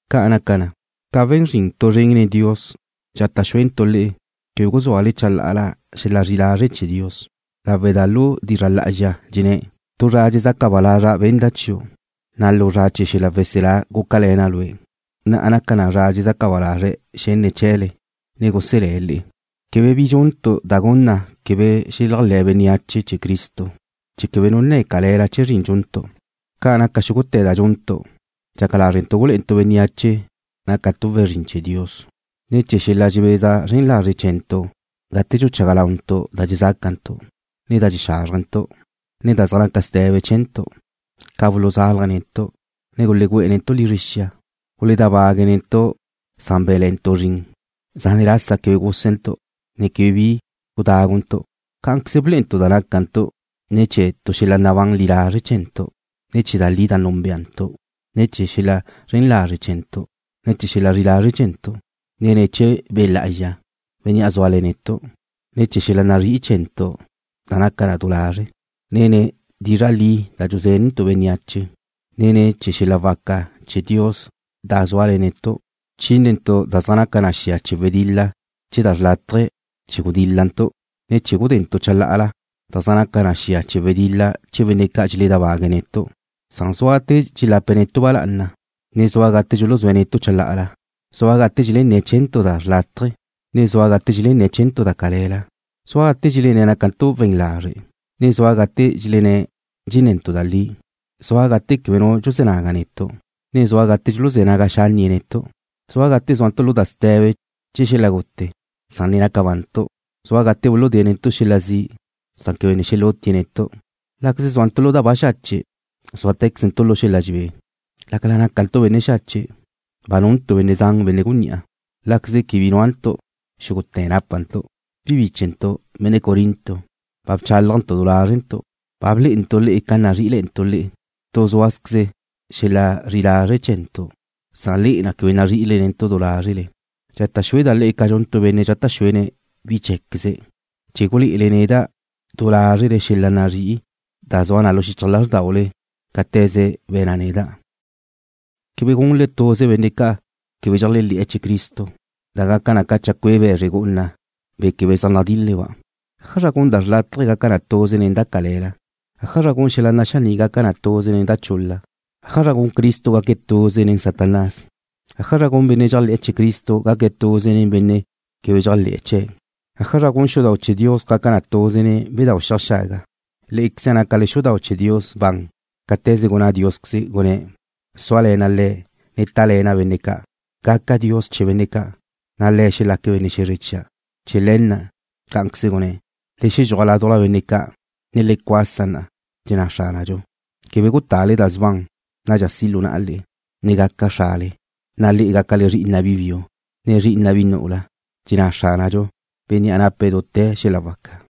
Ca' naca na, ca we̱n zrin tu zren nen Dios dxata' xuentu' le'e chee̱ quebe guzúale chalá'ala xel-la zri'i lazre' chee̱ Dios, lawe' da lu dizra' lá'azxa dxenné̱': Tu zra dxezaca ba lazra' benda' chiu', na' lu zra chee̱ xel-la weselá gúcale̱na' lue'. Na'a naca na zra dxezaca ba lazre̱' xenne̱' chee̱le, ne guselé̱' le'e. Quebe bi dxuntu' da gun na quebe xeléajle̱ bénneache chee̱ Cristo, chee̱ quebe nu nne̱ cale̱la chee̱ zrin dxuntu'. Ca naca xúgute̱ da dxuntu', dxaca lázrentu' gulé'entu' bénneache nácantu' we̱n zrin chee̱ Dios, ne̱ chee̱ xel-la dxebeza zren lazre' chee̱ntu' gate dxuchaga launtu' da dxezácantu', ne da dxexázrjentu', ne da zaj naca ste̱be chee̱ntu', ca buluzálaje̱' netu', ne gulegu'e̱ netu' lizre xia. Guledábague̱' netu' san bé̱nle̱'e̱ntu' zrin. Zane' lasa quebe gúsentu', ne quebe bi gudáguntu'. Cá'anqueze blé'entu' da nácantu' ne̱ chee̱ tu xel-la nabán li lazre' chee̱ntu', ne ne̱ chee̱ da li da núnbeantu', ne ne̱ chee̱ xel-la zren lazre' chee̱ntu', ne xel-la zri'i lazre' chee̱ntu', ne ne̱ chee̱ Be' Lá'azxa, Bénnea' zúale̱ne̱' netu', ne ne̱ chee̱ xel-la nazrí'i chee̱ntu' da naca na du lazre', ne ne̱ chee̱ dizra' li da dxuzénentu' bénneache, ne ne̱ chee̱ xel-la waca chee̱ Dios da zúale̱ na netu'. Bchínentu' da zaj naca ca xia chee̱ wedil-la chee̱ da xrlátaje chee̱ gudíl-lantu', ne chee̱ gudentu' chalá'ala da zaj naca ca xia chee̱ wedil-la chee̱ benne' ca' dxeledábague' netu'. Zua gate dxelape̱' netu' ba lá'ana', ne zua gate dxuluzúe̱' netu' chalá'ala. Zua gate dxelenné̱' chee̱ntu' da xrlátaje, ne zua gate dxelenné̱' chee̱ntu' da cale̱la. Zua gate dxelenné̱' nácantu' we̱n lazre', ne zua gate dxelenné̱' dxenne̱ntu' da li. Zua gate quebe nu dxuzé̱ naga netu', ne zua gate dxuluzé̱ naga xánnie̱' netu'. Zua gate zúantu' lu da ste̱be chee̱ xel-la gute, san ne naca bantu'. Zua gate dxuludée̱' netu' xel-la zi', san quebe ne xelutie̱' netu'. Láqueze zúantu' lu da baxache', zúate̱quezentu' lu xel-la dxebé. Lácala nácantu' benne' xache', ba nuntu' benne' zan benne' gunní'a. Láqueze quebe bi núantu', xúgute̱ nápantu'. Bi bíchentu', benne' Corinto, ba bchálajntu' du lázrentu'. Ba blé'entu' le'e ca nazrí'i lázrentu' le'e. Tu zúazqueze xel-la zri'i lazre' chee̱ntu', na' le'e na' quebe nazri'ile netu' du lázrele. Dxata' xueda' le'e ca dxun tu benne' dxata' xuene̱' bi cheé̱queze̱' chee̱ gulé'ele neda' du lázrele xel-la nazrí'i da zua na lu xichaj lázrdaule cáte̱ze be̱na' neda'. Quebe gunle tuze nen benne' quebe dxeléajle̱'e̱ chee̱ Cristo, da gaca na ca chacué' be̱zre gu'una, be̱ quebe zaj nadíl-leba'. ¿Ájazra gun da xrlátaje gaca na tuze nen da cale̱la? ¿Ájazra gun xel-la naxaní' gaca na tuze nen da chul-la? ¿Ájazra gun Cristo gaque̱' tuze nen Satanás? ¿Ájazra gun benne' dxéajle̱'e̱ chee̱ Cristo gaque̱' tuze nen benne' quebe dxéajle̱'e̱ chee̱'? ¿Ájazra gun xudau' chee̱ Dios gaca na tuze nen bedáu' xiaj xaga? Lé'equeze nácale xudau' chee̱ Dios ban cáte̱ze gunná Diósqueze: Súale̱na' le̱', ne tále̱na' benne' ca'. Gaca' Dios chee̱ benne' ca', na' le̱' xelaque̱' benne' xe̱zre chia'. Chee̱ le̱ na', cá'anqueze gunné̱': Le xedxúaj ládujla benne' ca', ne le cuasa na', dxenná Xránadxu. Quebe gutale da sban. Nadxa si' lu na'a le'e ne gaca' Xrale le'e, na' le'e gácale zri'ina' bi biu, ne zri'ina' bi nu'ula. Caní dxenná Xránadxu, Bénnea' nape̱' dute̱ xel-la waca.